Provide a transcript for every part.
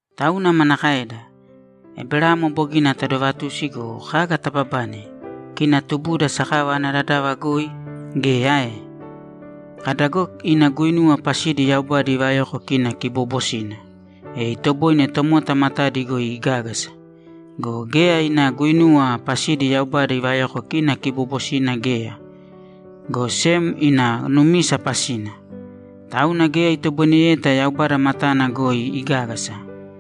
Tauna manakaeda? Eberamo bogina tadovatusi go, kaga tababane, kina tubuda sakava ana dadava goi? Geya, ae? Kada go ina guinuwa pasidi Yaubada ivayoko kina kiboobosina, e itoboine tomota matadi goi igágasa. Go geya ina guinuwa pasidi Yaubada ivayoko kina kiboobosina geya, go sem ina numisa pasina. Tauna geya itoboineyeta Yaubada matana goi igágasa.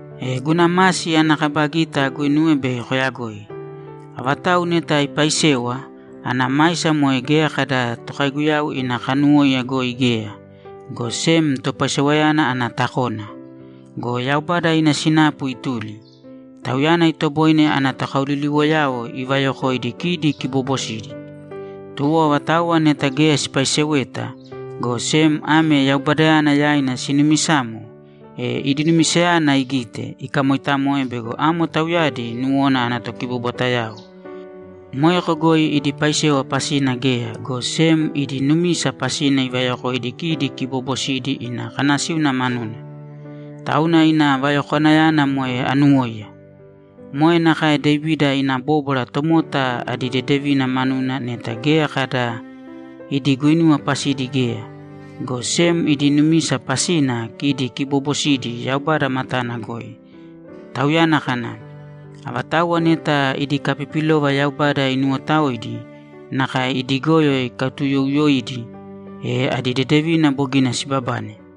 E guna masi ana kaba gita aguinuwe bei koyagoi. Avatau neta ipaisewa, ana maisa moe geya kada tokaiguyau ina kanuwóiya goi geya, go sem topaisewayana ana takona. Go Yaubada ina sinapu ituli. Tauyana itoboine ana tokaoliliwoyao ivayokoidi kidi kiboobosidi. Tuwo avatauwa neta geya sipaiseweta, go sem ame Yaubadayana yaina sinumisamo, e idi numisayana igite, ikamoitamoe bego amo tauyadi nuwona ana tokibobwatayao. Moeko goi idi paisewa pasina geya, go sem idi numisa pasina ivayokoidi kidi kiboobosidi ina kanasíuna manuna. Tauna ina vayokwanayana moe anuwóiya. Moe nakae Devida ina bóbwara tomota adi dedevina manuna neta geya kada idi guinuwa pasidi geya, go sem idi numisa pasina kidi kiboobosidi Yaubada matana goi. Tauyana kana, ‘Avatauwa neta idi kapipilova Yaubada inuwotaoidi nakae idi goyo ikatuuyouyoidi, e adi dedevina bogina sibabane.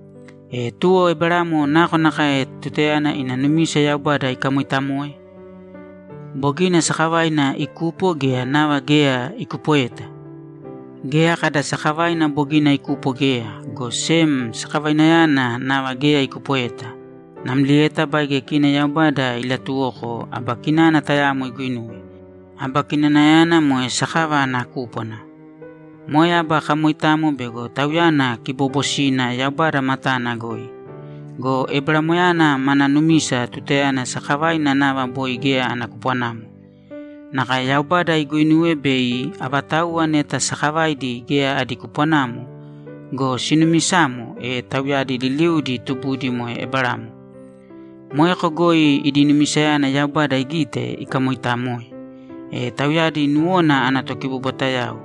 E tuwo Eberamo nakonakae tutayana ina numisa Yaubada ikamoitamoe? Bogina sakavaina ikupo, gea nava geya ikupoeta? Geya kada sakavaina bogina ikupo geya, go sem sakavainayana nava geya ikupoeta namlieta baige kina Yaubada ilatuwoko aba kinana tayamo iguinuwe. Aba kinanayana moe sakava ana kúpwana. Moe aba kamoitamo bego tauyana kiboobosina Yaubada matana goi. Go Eberamoyana mana numisa tutayana sakavaina nava boi geya ana kupwanamo. Nakae Yaubada iguinuwe bei avatauwa neta sakavaidi geya adi kupwanamo go, sinumisamo, e tauyadi liliudi tubudi moe Eberamo. Moeko goi idi numisayana Yaubada igite, ikamoitamoe, e tauyadi nuwona ana tokibobwatayao.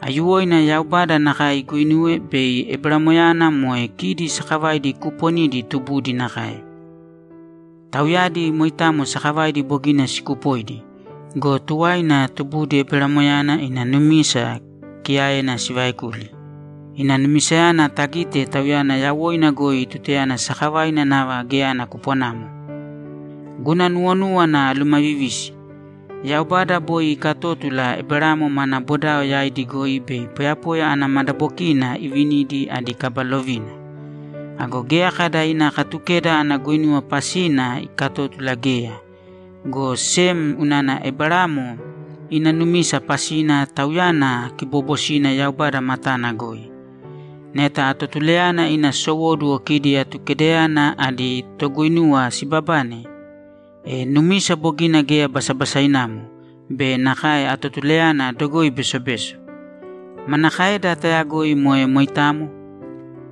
Aiyuwoina Yaubada nakae iguinuwe bei Eberamoyana moe kidi sakavaidi kuuponidi tubudi nakae. Tauyadi moitamo sakavaidi bogina sikupoidi go, tuwaina tubudi Eberamoyana ina numisa kiyaena sivaekuli. Ina numisayana tagite tauyana yawoina goi tutayana sakavaina nava geya ana kupwanamo. Guna nuwonúwana alumavivisi. Yaubada boi ikatótula Eberamo mana bodao yaidi goi bei poyapoya ana madabokiina ivinidi adi kaba lovina. Ago geya kada ina Katukeda ana guinuwa pasina ikatótula geya, go sem unana Eberamo ina numisa pasina tauyana kiboobosina Yaubada matana goi. Neta atotulayana ina sowóduwo kidi Atukedayana adi toguinuwa sibabane, e numisa bogina geya basabasainamo be nakae atotulayana dogoi besobeso. Manakaeda tayagoi moe moitamo?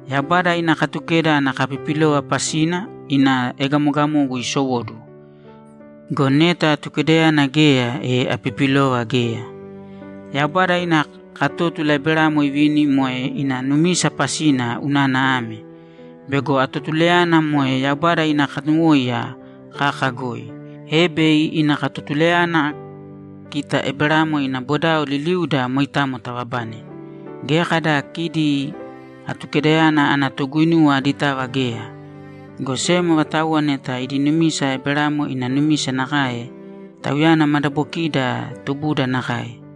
Yaubada ina Katukeda ana kapipilova pasina ina egamogamogu isowóduwo. Go neta Atukedayana geya, e apipilova geya. Yaubada ina katótula Eberamo ivini moe ina numisa pasina unana ame: Bego atotulayana moe Yaubada ina kanuwóiya kaka goi, e bei ina katotulayana kita Eberamo ina bodao liliuda moitamo tababane. Geya kada kidi Atukedayana ana toguinuwa aditava geya, go sem avatauwa neta idi numisa Eberamo ina numisa nakae, tauyana madabokiida tubuda nakae.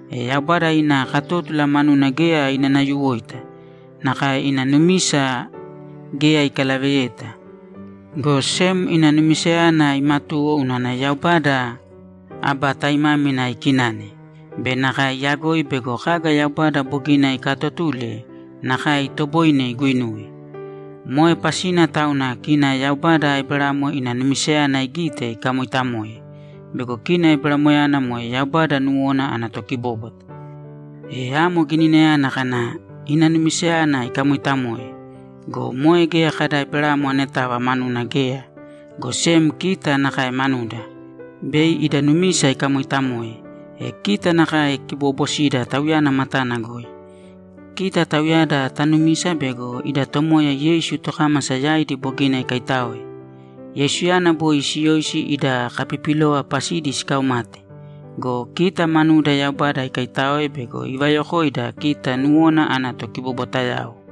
E Yaubada ina katótula manuna geya inanayuwoita; nakae ina numisa geya ikalaveyeta. Go sem ina numisayana imatuwo unana Yaubada aba taimámina ikinane be nakae iyagoi bego kaga Yaubada bogina ikaatotule, nakae itoboine iguinuwe. Moe pasina tauna kina Yaubada Eberamo ina numisayana igite, ikamoitamoe bego kina Eberamoyana moe Yaubada nuwona ana tokibóbwata. E amo gininayana kana, ‘Ina numisayana ikamoitamoe’ go, moe geya kada Eberamo anetava manuna geya, go sem kita nakae manuda! Bei ida numisa ikamoitamoe, e kita nakae kiboobosida Tauyana matana goi, kita tauyada tanumisa bego ida Tomoya Yeisu tokámasa yaidi bogina ikaitáoe. Yeisuyana boi siyoisi ida kapipilova pasidi sikaumate go, kita manuda Yaubada ikaitáoe bego ivayokoida kita nuwona ana tokibobwatayao.